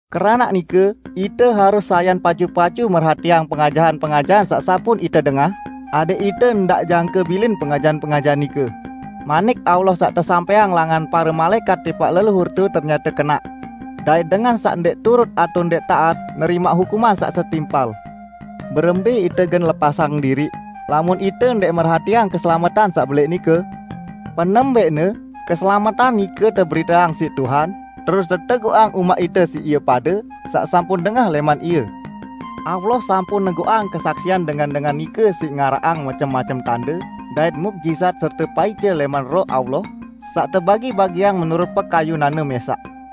Keranaq nike ite harus sayan pacu-pacu merhatiang pengajahan-pengajahan saq sampun ite dengah, adẽq ite ndaq jangke bilin pengajahan-pengajahan nike. Manik Allah saq tesampẽang langan pare malaẽkat tipaq leluhurte ternyate kenaq, dait dengan saq ndẽq turut atao ndẽq taat nerimaq hukuman saq setimpal. Berembẽ ite gen lepasang diriq, lamun ite ndẽq merhatiang keselametan saq belẽq nike? Penembẽqne, keselametan nike teberiteang siq Tuhan, terus teteguqang umaq ite siq ie pade saq sampun dengah lẽman Ie. Allah sampun neguqang kesaksian dengan-dengan nike siq ngaraqang macem-macem tande dait muqjizat serte paice lẽman Roh Allah saq tebagi-bagiang menurut pekayunan-Ne mẽsaq.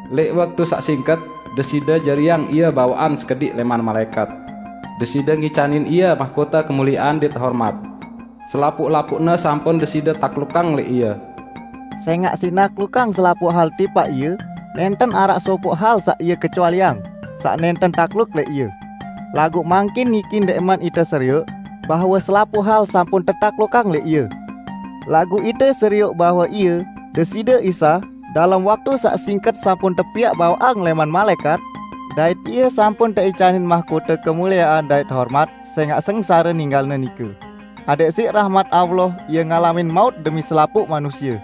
Lẽq waktu saq singket Deside jariang ie bawaqan sekediq lẽman malaẽkat. Deside ngicanin ie mahkote kemuliean dait hormat. Selapuq-lapuqne sampun Deside taklukang lẽq ie." Sẽngaq siq naklukang selapuq hal tipaq Ie, nẽnten araq sopoq hal saq Ie kecualiang, saq nẽnten takluk lẽq Ie. Laguq mangkin niki ndẽqman ite serioq, bahwe selapuq hal sampun tetaklukang lẽq Ie. Laguq ite serioq bahwe Ie, Deside Isa, dalem waktu saq singket sampun tepiaq bawaqan lẽman malaẽkat, dait Ie sampun teicanin mahkote kemuliean dait hormat sẽngaq sengsare ninggal-Ne nike, adẽq siq rahmat Allah Ie ngalamin maut demi selapuq manusie.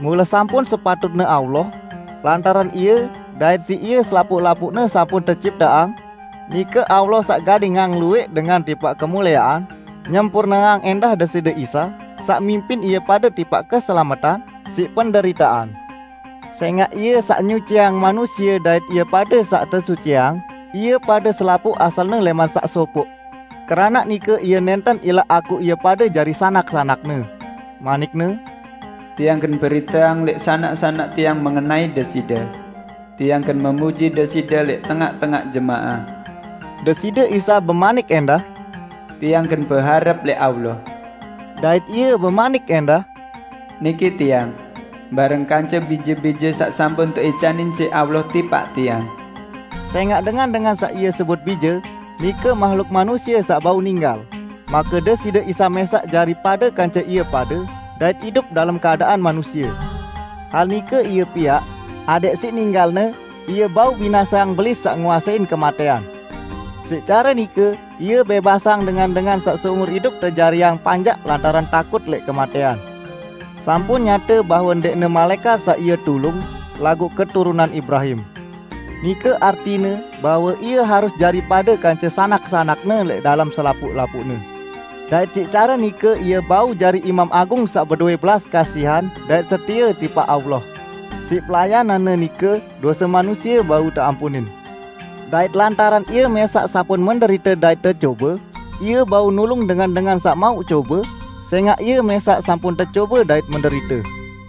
Mule sampun sepatutne Allah -- lantaran Ie dait siq Ie selapuq-lapuqne sampun tecipteang -- nike Allah saq gadingang luwẽq dengan tipaq kemuliean, nyempurneang ẽndah Deside Isa, saq mimpin ie pade tipaq keselametan, siq penderitean. Sẽngaq Ie saq nyuciang manusie dait ie pade saq tesuciang, ie pade selapuq asalne lẽman saq Sopoq; keranaq nike Ie nẽnten ilaq akuq ie pade jari sanak-sanak-Ne. Manik-Ne, "Tiang gen beriteang lẽq sanak-sanak Tiang mengenai Deside. Tiang gen memuji Deside lẽq tengaq-tengaq jemaah." Deside Isa bemanik ẽndah, "Tiang gen beharep lẽq Allah." Dait Ie bemanik ẽndah, "Niki Tiang, bareng kance bije-bije saq sampun teicanin siq Allah tipaq Tiang." Sẽngaq dengan-dengan saq Ie sebut bije, nike mahluk manusie saq bau ninggal, make Deside Isa mẽsaq jari pade kance ie pade dait idup dalem keadaan manusie. Hal nike Ie piaq, adẽq siq ninggal-Ne Ie bau binaseang Belis saq nguasein kematẽan. Siq care nike Ie bẽbasang dengan-dengan saq seumur idup tejariang panjak lantaran takut lẽq kematẽan. Sampun nyate bahwe ndẽqne malaẽkat saq Ie tulung, laguq keturunan Ibrahim. Nike artine bahwe Ie harus jari pade kance sanak-sanak-Ne lẽq dalem selapuq-lapuqne. Dait siq care nike Ie bau jari Imam Agung saq bedowẽ belas kasihan dait setie tipaq Allah. Siq pelayanan-Ne nike dose manusie bau teampunin. Dait lantaran Ie mẽsaq sampun menderite dait tecobe, Ie bau nulung dengan-dengan saq mauq cobe, sẽngaq Ie mẽsaq sampun tecobe dait menderite.